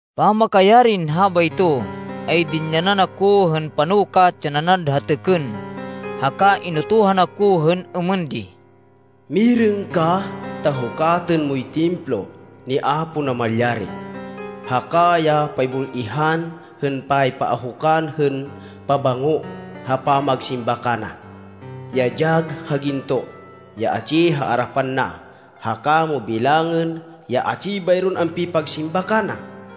Pamakayarin habayto, ay dinyanan ako hên panukat ya nanad ha têkên haka inutuhan ako hên êmên di, “Mirêng ka ta hukatên moy Templo ni Apo Namalyari haka ya paybul-ihan hên paypaahukan hên pabango ha pamagsimba kana, ya dyag ha ginto, ya atsi ha arapan na. Haka mo bilangên ya atsi bayron ampipagsimba kana.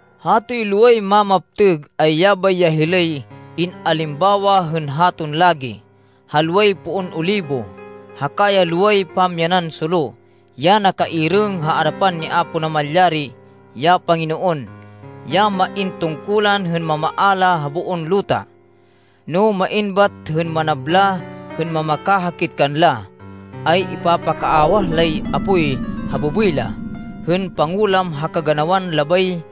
Hatoy loway mamaptêg, ay yabay ya hilay in-alimbawa hên haton lagi, ha loway poon olibo haka ya loway pamyanan solo ya nakairêng ha arapan ni Apo Namalyari, ya Panginoon, ya main tungkulan hên mamaala ha boon luta. No main bat hên manabla hên mamakahakit kanla, ay ipapakaawah lay apoy ha bêbêy la, hên pangulam ha kaganawan labay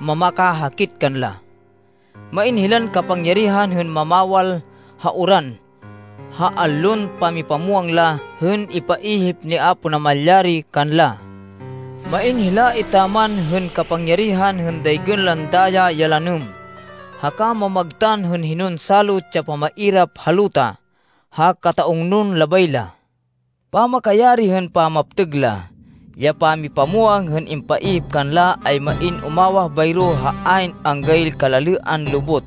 mamakahakit kanla. Main hilan kapangyarihan hên mamawal ha uran ha allon pamipamwang la hên ipaihip ni Apo Namalyari kanla. Main hila etaman hên kapangyarihan hên daygên lan daya ya lanêm, haka mamagtan hên hinon salot ya pamairap ha luta ha kata-ungnon labay la. Pamakayari hên pamaptêg la, ya pamipamwang hên impaihip kanla, ay main umawah bayro ha ayn anggay kalalêan lubot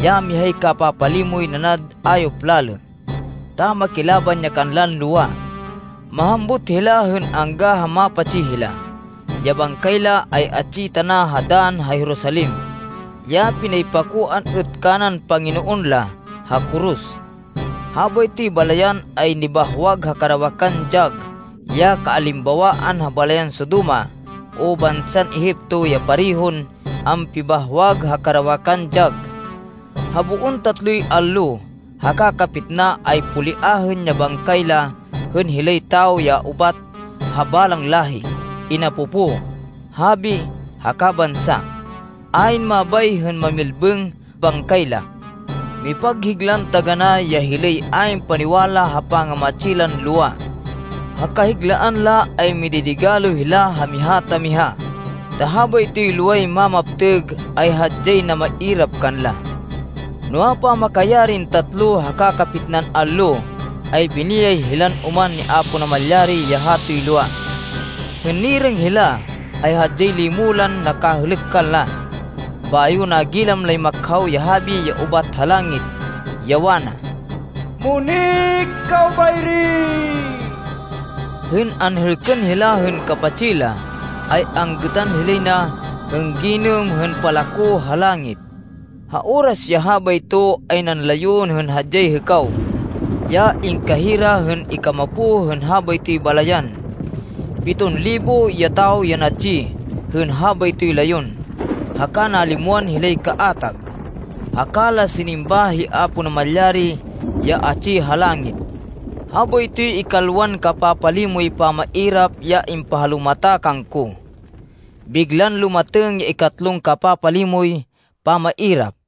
ya mihay kapapalimoy nanad ayop lalê, ta makilaban ya kanlan lowa. Mahambut hila hên angga ha mapatsi hila. Ya bangkay la ay atsi tana ha dann ha Jerusalem, ya pinaypakoan êt kanan Panginoon la ha koros. Habaytoy balayan ay nibahwag ha karawakan dyag ya kaalimbawaan ha balayan Sodoma o bansan Egipto ya parehon ampibahwag ha karawakan dyag. Ha boon tatloy allo haka kapitna, ay poliahên ya bangkay la hên hilay tawo ya ubat ha balang láhi, inapopo, habi, haka bansa. Ayn mabay hên mamilbêng bangkay la. Mipaghiglan taganá ya hilay ayn paniwala ha pangamatsi lan lowa. Ha kahiglaan la ay mididigalo hila ha miha ta miha, ta habaytoy loway mamaptêg ay hadyay namairap kanla. Noa, pamakayarin tatlo haka kapitnan allo, ay biniyay hilan oman ni Apo Namalyari ya hatoy lowa. Hên nirêng hila, ay hadyay limo lan nakahêlêk kanla. Bayo nagilam lay makhaw ya habi ya ubat ha langit, ya wana, “Munik kaw bayri!” Hên anhêlkên hila hên kapatsi la, ay anggêtan hilay na hên ginêm hên palako ha langit. Ha oras ya habayto ay nanlayon hên hadyay hêkaw, ya ingkahira hên ikamapo hên habaytoy balayan. Piton libo ya tawo ya natsi hên habaytoy layon, haka nalimwan hilay kaatag, haka la sinimba hi Apo Namalyari ya atsi ha langit. Habaytoy ikalwan kapapalimoy pamairap ya impahalumata kangko. Biglan lumatêng ya ikatlon kapapalimoy pamairap.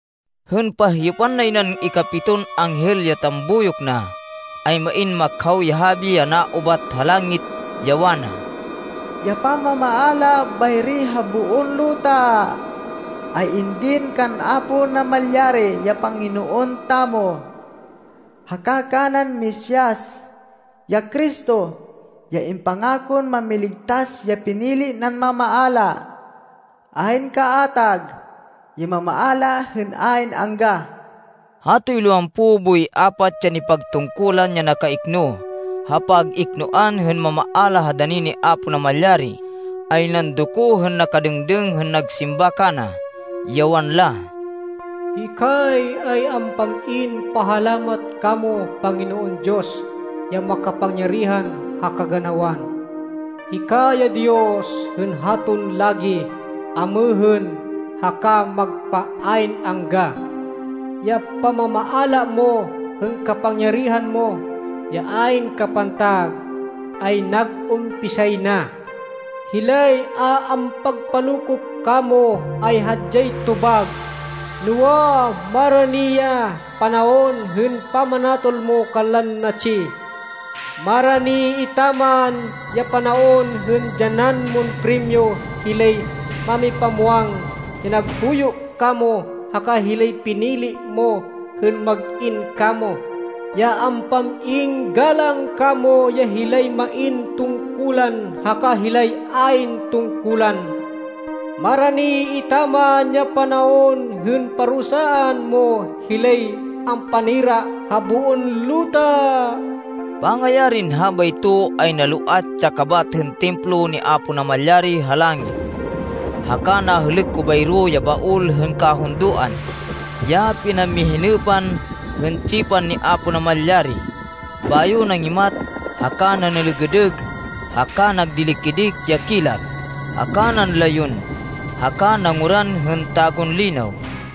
Hên pahyêpan nay nan ikapiton anghel ya tambuyok na, ay main makhaw ya habi ya naubat ha langit, ya wana, “Ya pamamaala bayri ha boon luta ay indin kan Apo Namalyari, ya Panginoon tamo, haka kanan Mesias, ya Cristo, ya impangakon Mámiligtas ya pinili nan mamaala. Ayn kaatag ya mamaala hên ayn angga.” Hatoy lowampo boy apat ya nipagtungkulan ya nakaikno ha pag-iknoan hên mamaala ha dani ni Apo Namalyari ay nandoko hên nakadêngdêng hên nagsimba kana, ya wanla, “Hikay ay ampam-in pahalamat kamo Panginoon Diyos, ya makapangyarihan ha kaganawan. Hika ya Diyos hên haton lagi, amêhên, haka magpa ayn angga. Ya pamamaala mo hên kapangyarihan mo, ya ayn kapantag, ay nag-umpisay na. Hilay a ampagpalokop kamo, ay hadyay tobag, noa, marani ya panaon hên pamanatol mo kanlan natsi. Marani etaman ya panaon hên dyanan mon primyo hilay mámipamwang ya naghuyo kamo, haka hilay pinili mo hên mag-in kamo, ya ampam-in galang kamo, ya hilay main tungkulan haka hilay ayn tungkulan. Marani etaman ya panaon hên parusaan mo hilay ampanira ha boon luta.” Pangayarin habayto, ay naloat ya kabat hên Templo ni Apo Namalyari ha langit, haka nahêlêk ko bayro ya Baol hên Kahundoan, ya pinamihinêpan hên tsipan ni Apo Namalyari. Bayo nangimat haka nanêlêgêdêg haka nagdili-kidik ya kilat, haka nanlayon haka nanguran hên tagunlinaw.